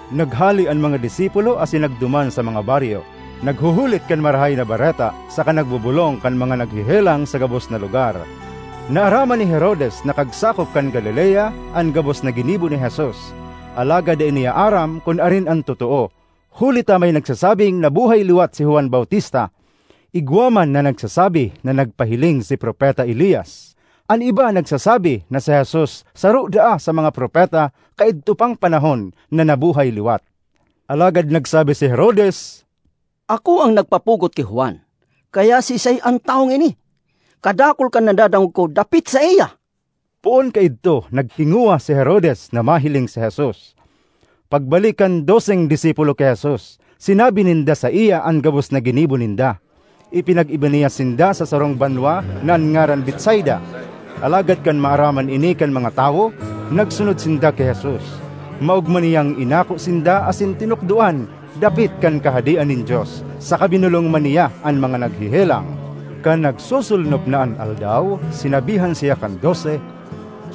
Naghale an mga disipulo asin nagduman sa mga baryo, naghuhulit kan Marahay na Bareta, saka nagbobolong kan mga naghehelang sa gabos na lugar. Naaraman ni Herodes na kagsakop kan Galilea an gabos na ginibo ni Jesus, alagad dai niya aram kun arin an totoo, huli ta may nagsasabing nabuhay liwat si Juan Bautista. Igwa man na nagsasabi na nagpahiling si Propeta Elias. An iba nagsasabi na si Jesus saro daa sa mga propeta kaidto pang panahon na nabuhay liwat. Alagad nagsabi si Herodes, “Ako an nagpapugot ki Juan; kaya siisay an tawong ini? Kadakul kan nadadangog ko dapit saiya!” Poon kaidto naghingowa si Herodes na mahiling si Jesus. Pagbalik kan doseng disipulo ki Jesus, sinabi ninda saiya an gabos na ginibo ninda. Ipinag-iba niya sinda sa sarong banwa na an ngaran Betsaida. Alagad kan maaraman ini kan mga tawo, nagsunod sinda ki Jesus. Maogma niyang inako sinda asin tinukdoan dapit kan Kahadean nin Dios saka binolong man niya an mga naghehelang. Kan nagsosolnop na an aldaw, sinabihan siya kan Dose,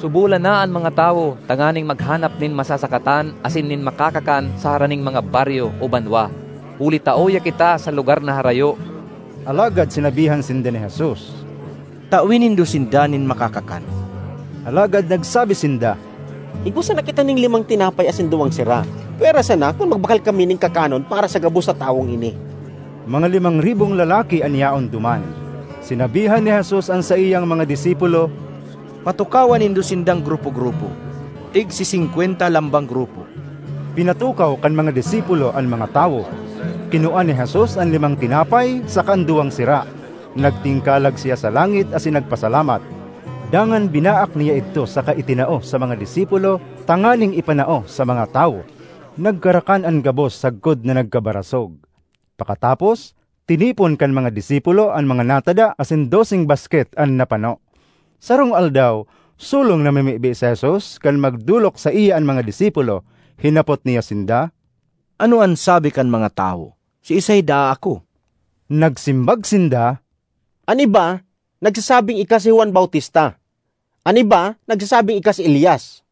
“Subolan na an mga tawo tanganing maghanap nin masasakatan asin nin makakakan sa haraning mga baryo o banwa huli ta uya kita sa lugar na harayo.” Alagad sinabihan sinda ni Jesus, “Tawe nindo sinda nin makakakan.” Alagad nagsabi sinda, “Igwa sana kita nin limang tinapay asin duwang sira, pwera sana kun magbakal kami nin kakanon para sa gabos na tawong ini.” Mga limang ribong lalaki an yaon duman. Sinabihan ni Jesus an saiyang mga disipulo, “Patukawa nindo sindang grupo-grupo, tigsisingkwenta lambang grupo.” Pinatukaw kan mga disipulo an mga tawo. Kinua ni Jesus an limang tinapay saka an duwang sira. Nagtingkalag siya sa langit asin nagpasalamat. Dangan binaak niya idto saka itinao sa mga disipulo tanganing ipanao sa mga tawo. Nagkarakan an gabos sagkod na nagkabarasog. Pakatapos, tinipon kan mga disipulo an mga natada asin doseng basket an napano. Sarong aldaw, solong namimibi si Jesus kan magdolok saiya an mga disipulo. Hinapot niya sinda, “Ano an sabi kan mga tawo, siisay daa ako?” Nagsimbag sinda, “An iba nagsasabing ika si Juan Bautista; an iba nagsasabing ika si Elias;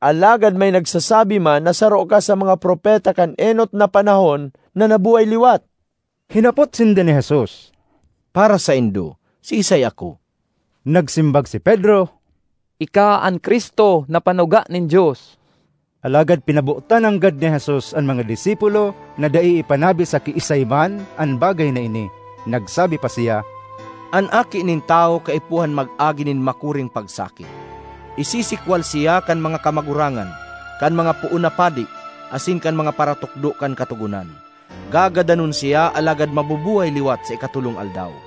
alagad may nagsasabi man na saro ka sa mga propeta kan enot na panahon na nabuhay liwat.” Hinapot sinda ni Jesus, “Para saindo, siisay ako?” Nagsimbag si Pedro, “Ika an Cristo na panuga nin Dios.” Alagad pinabotan nanggad ni Jesus an mga disipulo na dai ipanabi sa kiisay man an bagay na ini. Nagsabi pa siya, “An Aki nin Tawo kaipuhan mag-agi nin makuring pagsakit. Isisikwal siya kan mga kamagurangan, kan mga poon na padi, asin kan mga paratukdo kan Katogonan. Gagadanon siya alagad mabubuhay liwat sa ikatolong aldaw.”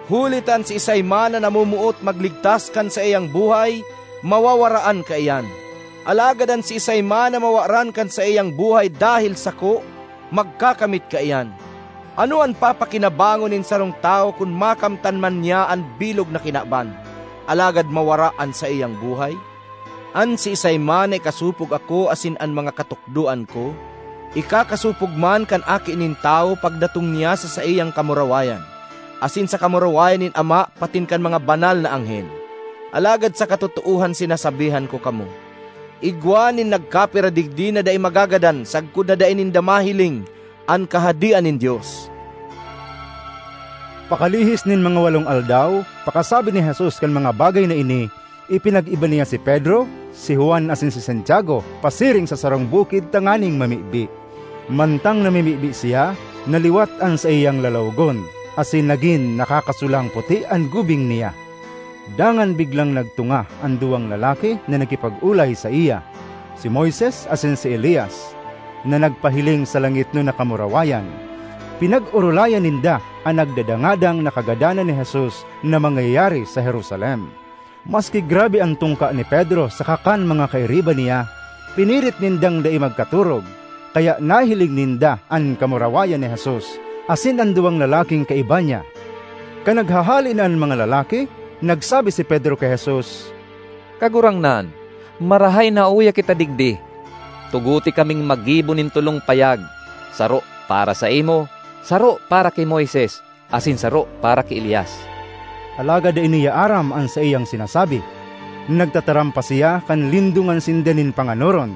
Huli ta an siisay man na namomoot magligtas kan saiyang buhay, mawawaraan kaiyan; alagad an siisay man na mawaran kan saiyang buhay dahel sako, magkakamit kaiyan. Ano an papakinabangon nin sarong tawo kun makamtan man niya an bilog na kinaban, alagad mawara an saiyang buhay? An siisay man na ikasopog ako asin an mga katukdoan ko, ikakasopog man kan Aki nin Tawo pagdatong niya sa saiyang kamurawayan asin sa kamurawayan nin Ama patin kan mga banal na anghel. Alagad sa katotoohan sinasabihan ko kamo, igwa nin nagkapira digdi na dai magagadan sagkod na dai ninda mahiling an Kahadean nin Dios.” Pakalihis nin mga walong aldaw pakasabi ni Jesus kan mga bagay na ini, ipinag-iba niya si Pedro, si Juan asin si Santiago pasiring sa sarong bukid tanganing mamibi. Mantang namimibi siya, naliwat an saiyang lalawogon asin nagin nakakasulang puti an gubing niya. Dangan biglang nagtunga an duwang lalaki na nakipag-olay saiya: si Moises asin si Elias, na nagpahiling sa langitnon na kamurawayan. Pinag-orolayan ninda an nagdadangadang na kagadanan ni Jesus na mangyayari sa Jerusalem. Maski grabe an tungka ni Pedro saka kan mga kairiba niya, pinirit nindang dai magkatorog, kaya nahiling ninda an kamurawayan ni Jesus asin an duwang lalaking kaiba niya. Kan naghahale na an mga lalaki, nagsabi si Pedro ki Jesus, “Kagurangnan, marahay na uya kita digdi. Tugote kaming maggibo nin tolong payag, saro para saimo, saro para ki Moises, asin saro para ki Elias.” (Alagad dai niya aram an saiyang sinasabi.) Nagtataram pa siya kan lindongan sinda nin panganoron.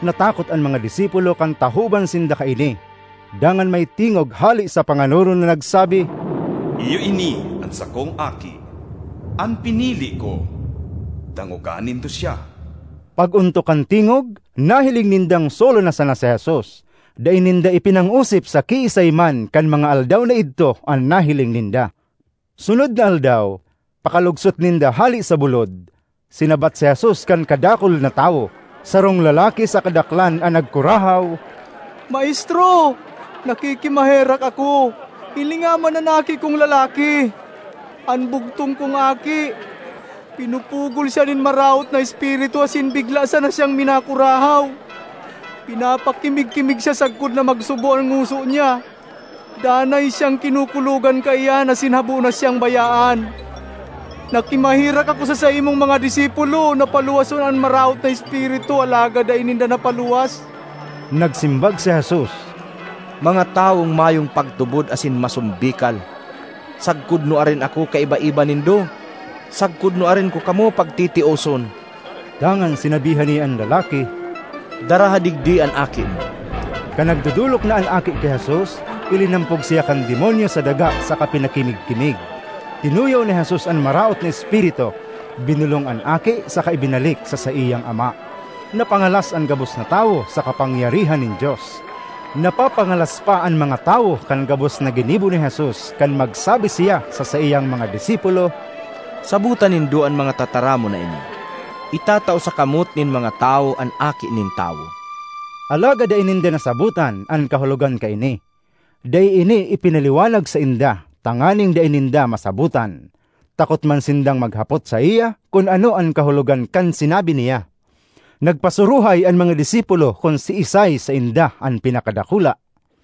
Natakot an mga disipulo kan tahoban sinda kaini. Dangan may tingog hale sa panganoron na nagsabi, “Iyo ini an sakong Aki, an pinili ko; dangoga nindo siya!” Pag-ontok kan tingog, nahiling nindang solo na sana si Jesus. Dai ninda ipinangosip sa kiisay man kan mga aldaw na idto an nahiling ninda. Sunod na aldaw, pakalugsot ninda hale sa bulod, sinabat si Jesus kan kadakul na tawo. Sarong lalaki sa kadaklan an nagkurahaw, “Maestro! Nakikimaherak ako, hilinga man an aki kong lalaki—an bugtong kong aki! Pinupugol siya nin maraot na espiritu asin bigla sana siyang minakurahaw; pinapakimig-kimig siya sagkod na magsubo an ngoso niya. Danay siyang kinukulogan kaiyan, asin habo na siyang bayaan! Nakimaherak ako sa saimong mga disipulo na paluwason an maraot na espiritu, alagad dai ninda napaluwas.” Nagsimbag si Jesus, “Mga tawong mayong pagtubod asin masombikal! Sagkod nuarin ako kaiba-iba nindo? Sagkod nuarin ko kamo pagtitioson!” Dangan sinabihan niya an lalaki, “Daraha digdi an aki mo.” Kan nagdodolok na an aki ki Jesus, ilinampog siya kan demonyo sa daga saka pinakimig-kimig. Tinuyaw ni Jesus an maraot na espiritu, binolong an aki saka ibinalik sa saiyang ama. Napangalas an gabos na tawo sa kapangyarihan nin Dios. Napapangalas pa an mga tawo kan gabos na ginibo ni Jesus kan magsabi siya sa saiyang mga disipulo, ”Sabota nindo an mga tataramon na ini: itatao sa kamot nin mga tawo an Aki nin Tawo.” Alagad dai ninda nasabotan an kahulogan kaini. Dai ini ipinaliwanag sainda tanganing dai ninda masabotan. Takot man sindang maghapot saiya kun ano an kahulogan kan sinabi niya. Nagpasuruhay an mga disipulo kun siisay sainda an pinakadakula.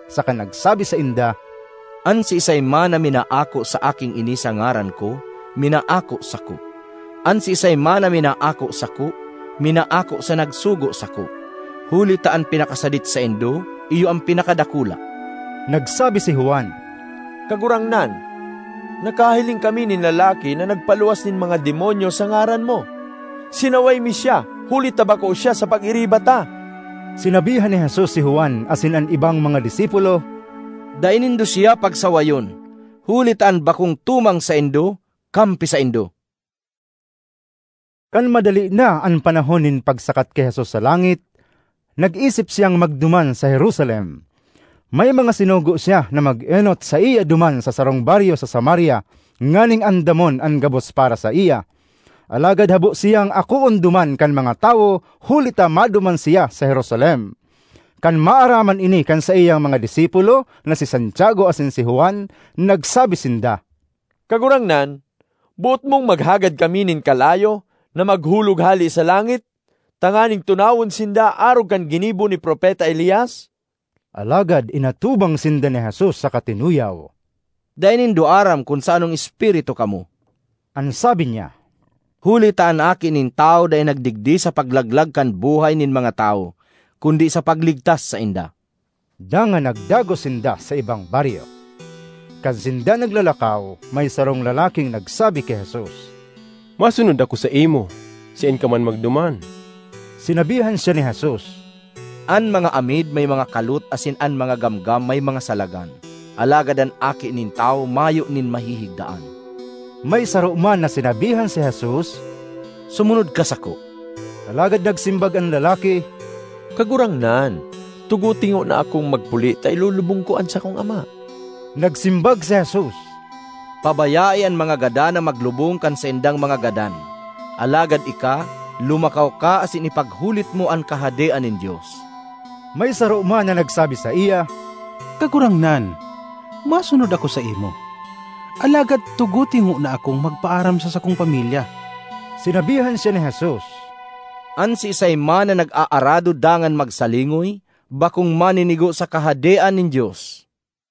saka nagsabi sainda, “An siisay man na minaako sa aking ini sa ngaran ko, minaako sako; an siisay man na minaako sako, minaako sa nagsugo sako. Huli ta an pinakasadit saindo, iyo an pinakadakula.” Nagsabi si Juan, “Kagurangnan, nakahiling kami nin lalaki na nagpaluwas nin mga demonyo sa ngaran mo. Sinaway mi siya huli ta bako siya sa pag-iriba ta.” Sinabihan ni Jesus si Juan asin an ibang mga disipulo, “Dai nindo siya pagsawayon, huli ta an bakong tumang saindo, kampi saindo.” Kan madali na an panahon nin pagsakat ki Jesus sa langit, nag-isip siyang magduman sa Jerusalem. May mga sinugo siya na mag-enot saiya duman sa sarong baryo sa Samaria nganing andamon an gabos para saiya. Alagad habo siyang akoon duman kan mga tawo huli ta maduman siya sa Jerusalem. Kan maaraman ini kan saiyang mga disipulo na si Santiago asin si Juan, nagsabi sinda, “Kagurangnan, boot mong maghagad kami nin kalayo na maghulog hale sa langit tanganing tunawon sinda arog kan ginibo ni Propeta Elias?” Alagad inatubang sinda ni Jesus saka tinuyaw. (“Dai nindo aram kun sa anong espiritu kamo,” an sabi niya, “huli ta an Aki nin Tawo dai nagdigdi sa paglaglag kan buhay nin mga tawo kundi sa pagligtas sainda.”) Dangan nagdagos sinda sa ibang baryo. Kan sinda naglalakaw, may sarong lalaking nagsabi ki Jesus, “Masunod ako saimo saen ka man magduman.” Sinabihan siya ni Jesus, “An mga amid may mga kalot asin an mga gamgam may mga salagan, alagad an Aki nin Tawo mayo nin mahihigdaan.” May saro man na sinabihan si Jesus, “Sumunod ka sako.” Alagad nagsimbag an lalaki, “Kagurangnan, tugote ngona akong magpuli ta ilulubong ko an sakong ama.” Nagsimbag si Jesus, “Pabayae an mga gadan na maglubong kan saindang mga gadan. Alagad ika, lumakaw ka asin ipaghulit mo an Kahadean nin Dios.” May saro man na nagsabi saiya, “Kagurangnan, masunod ako saimo, alagad tugote ngona akong magpaaram sa sakong pamilya.” Sinabihan siya ni Jesus, “An siisay man na nag-aarado dangan magsalingoy, bakong maninigo sa Kahadean nin Dios.”